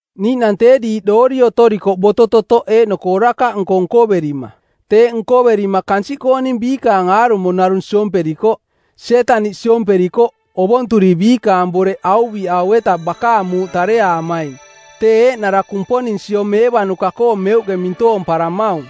Niiꞌnang tee diiꞌ doori otorikoꞌ boto-totoꞌ eeꞌnoko orakaꞌnko nkoverima. Teeꞌ nkoverima kansiꞌkooning biikaang aarumo narung siomperikoꞌ. Sietaniꞌ siomperikoꞌ, ovonturi biikaang boreꞌ auviꞌau-eta bakaang muuꞌ tareaamaing, tee eeꞌnara Kumponing siomeevanuka-koo meuꞌke mintoomparamaung.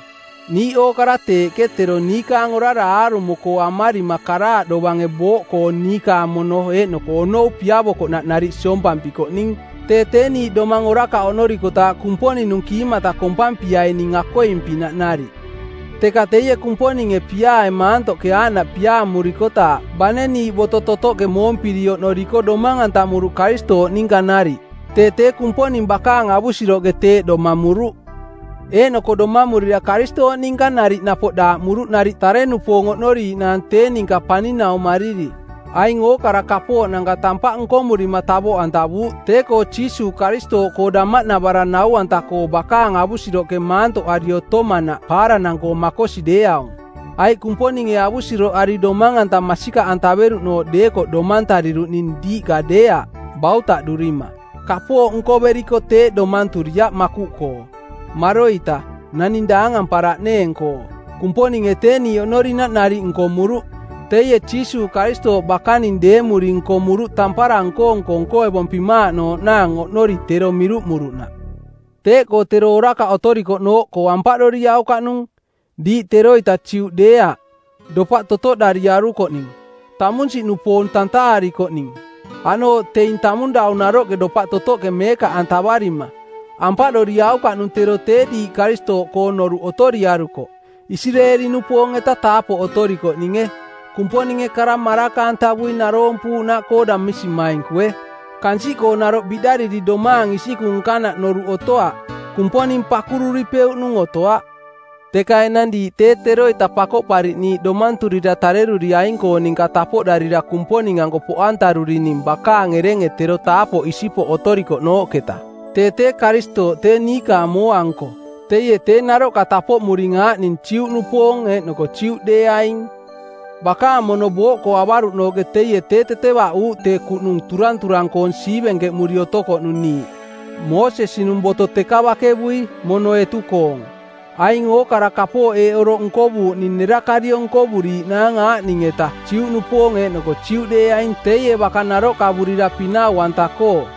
Niiꞌ ookara teeꞌke tero niikaang orara aarumo-koo amarima karaaꞌ dovange booꞌkoo niikaang mono eeꞌnoko onou piavokoꞌnaꞌ nariꞌ siompampikoꞌning. Tee tee niiꞌ domang orakaꞌ oꞌnorikotaaꞌ Kumponing-nung kiimata kompampiaining akoing-pinaꞌ nariꞌ. Teka teie Kumponinge piaae maantoꞌke aaꞌnaꞌ piaamurikotaaꞌ bane niiꞌ boto totoꞌke moompiri oꞌnoriko domang-antamuruꞌ Karistooꞌ ninka nariꞌ; Tee tee Kumponing bakaang avusiroꞌke teeꞌ domamuruꞌ. Eeꞌnoko domamurira Karistooꞌ ninka nariꞌ napoꞌ daaꞌmuruꞌ nariꞌ tare-nupoong oꞌnoriiꞌnaang tee ninka paninaumariri. Aing ookara kapooꞌnanka tampaꞌ nkomurima tavoꞌantavuuꞌ tee-koo Jiisuuꞌ Karistooꞌkoo damaꞌnavarang nau-anta-koo bakaang avusiroꞌke maantoꞌari otomanaꞌ paaranang-koo makosi deeaung. Aiꞌ Kumponinge avusiroꞌari domang-anta masikaꞌantaveruꞌnooꞌ deekoꞌ domantariruꞌning, diiꞌka deeaꞌ, bautaꞌdurima. Kapooꞌ nkoveriko teeꞌ domanturiaꞌ makuꞌkoo. Maroita, naning daangamparaꞌneeng-koo. Kumponinge tee niiꞌ oꞌnorinaꞌ nariꞌ nkomuruꞌ. Teie Jiisuuꞌ Karistooꞌ bakaning deemuri nkomuruꞌ tampara nko-nko nkoevompimaaꞌnooꞌnaang oꞌnori tero miruꞌmuruꞌnaꞌ. Teeꞌkoo tero orakaꞌ otorikoꞌnooꞌkoo ampaꞌdoriaukaꞌnung. Diiꞌ teroita Juꞌdeeaꞌ, dopaꞌ totoꞌdariarukoꞌning, tamunsiꞌnupoong tantaarikoꞌning, aꞌnooꞌ teing tamung dau naroꞌ dopaꞌ totoꞌke meekaꞌantavarima. Ampaꞌdoriaukaꞌnung tero tee diiꞌ Karistooꞌkoong noruꞌ otoriarukoꞌ, Isireeli-nupoong-eta taapoꞌ otorikoꞌninge, Kumponinge kara maraka-antavui naroompuuꞌnaꞌkoo damisimainkue, kansiꞌkoo naroꞌ biꞌdariri domaang isikung nkanaꞌ noruꞌ otoaꞌ, Kumponing pakurupeuꞌnung otoaꞌ. Teka enang diiꞌ tee teroita Pakoꞌpariꞌniiꞌ domanturira tareruriaing-koong ninka tapoꞌdarira Kumponing-anko poꞌantarurining bakaang erenge tero taapoꞌ isipoꞌ otorikoꞌnooꞌketa. Tee tee Karistooꞌ tee niikaang mooa-nko. Teie tee naroꞌka tapoꞌmuring aaꞌning Juꞌnupoong eeꞌnoko Juꞌ deeaing. Bakaang mono booꞌkoo avaruꞌnooꞌke teie tee tetevaꞌuuꞌ tee kuꞌnung turanturang-koong siivenkeꞌmuri otokoꞌnung niiꞌ. Moosesi-nung boto teka bakevui, mono etu-koong. Aing ookara kapooꞌ eeꞌ oroꞌ nkovuuꞌning nerakariong nkovuriiꞌnaang aaꞌning-eta Juꞌnupoong eeꞌnoko Juꞌdeeaing teie baka naroꞌkavurira pinau-anta-koo.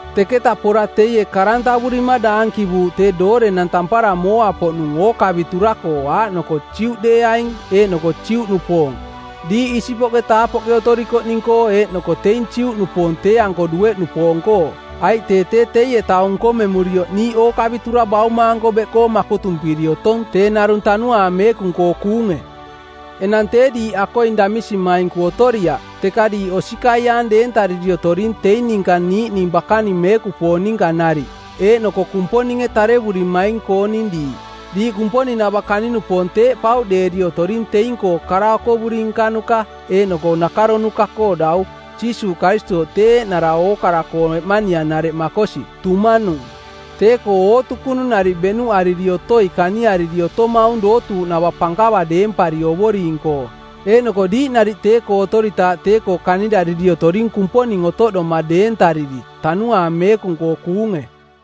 Teketaꞌ pora teie karantavurima˜ daankivuuꞌ tee doorenang tampara mooa-poꞌnung ookavitura-koo aaꞌnoko Juꞌdeeaing eeꞌnoko Juꞌnupoong, diiꞌ isipoꞌke taapoꞌke otorikoꞌning-koo eeꞌnoko teing Juꞌnupoong tee-anko dueꞌnupoong-koo. Aiꞌ tee tee teie taung nkomemurioꞌ niiꞌ ookavitura Bauma-anko beꞌkoo makotumpiri otong tee narung Tanuaang Meekung-koo kuunge. Enang tee diiꞌ akoing damisimainku otoriaꞌ, teka diiꞌ osikaiaang deentariri otoring teing ninka niiꞌning bakaning meekupoong ninka nariꞌ, eeꞌnoko Kumponinge tarevurimaing-kooning diiꞌ. Diiꞌ Kumponing-nava kani-nupoong teeꞌ pauꞌdeeri otoring teing-koo kara okovuri nkanuka eeꞌnoko nakaronuka˜koo dau, Jiisuuꞌ Karistooꞌ tee eeꞌnara ookara-koo eꞌmanianareꞌ makosi, tumanung. Tee-koo ootukunung nariꞌ beꞌnuꞌariri otoi kaniari otomaung dootuuꞌnava pankava deempari Ovoring-koo. Eeꞌnoko diiꞌ nariꞌ tee-koo otoritaaꞌ tee-koo kanirariri otoring Kumponing otoꞌdoma deentariri Tanuaang Meekung-koo kuunge.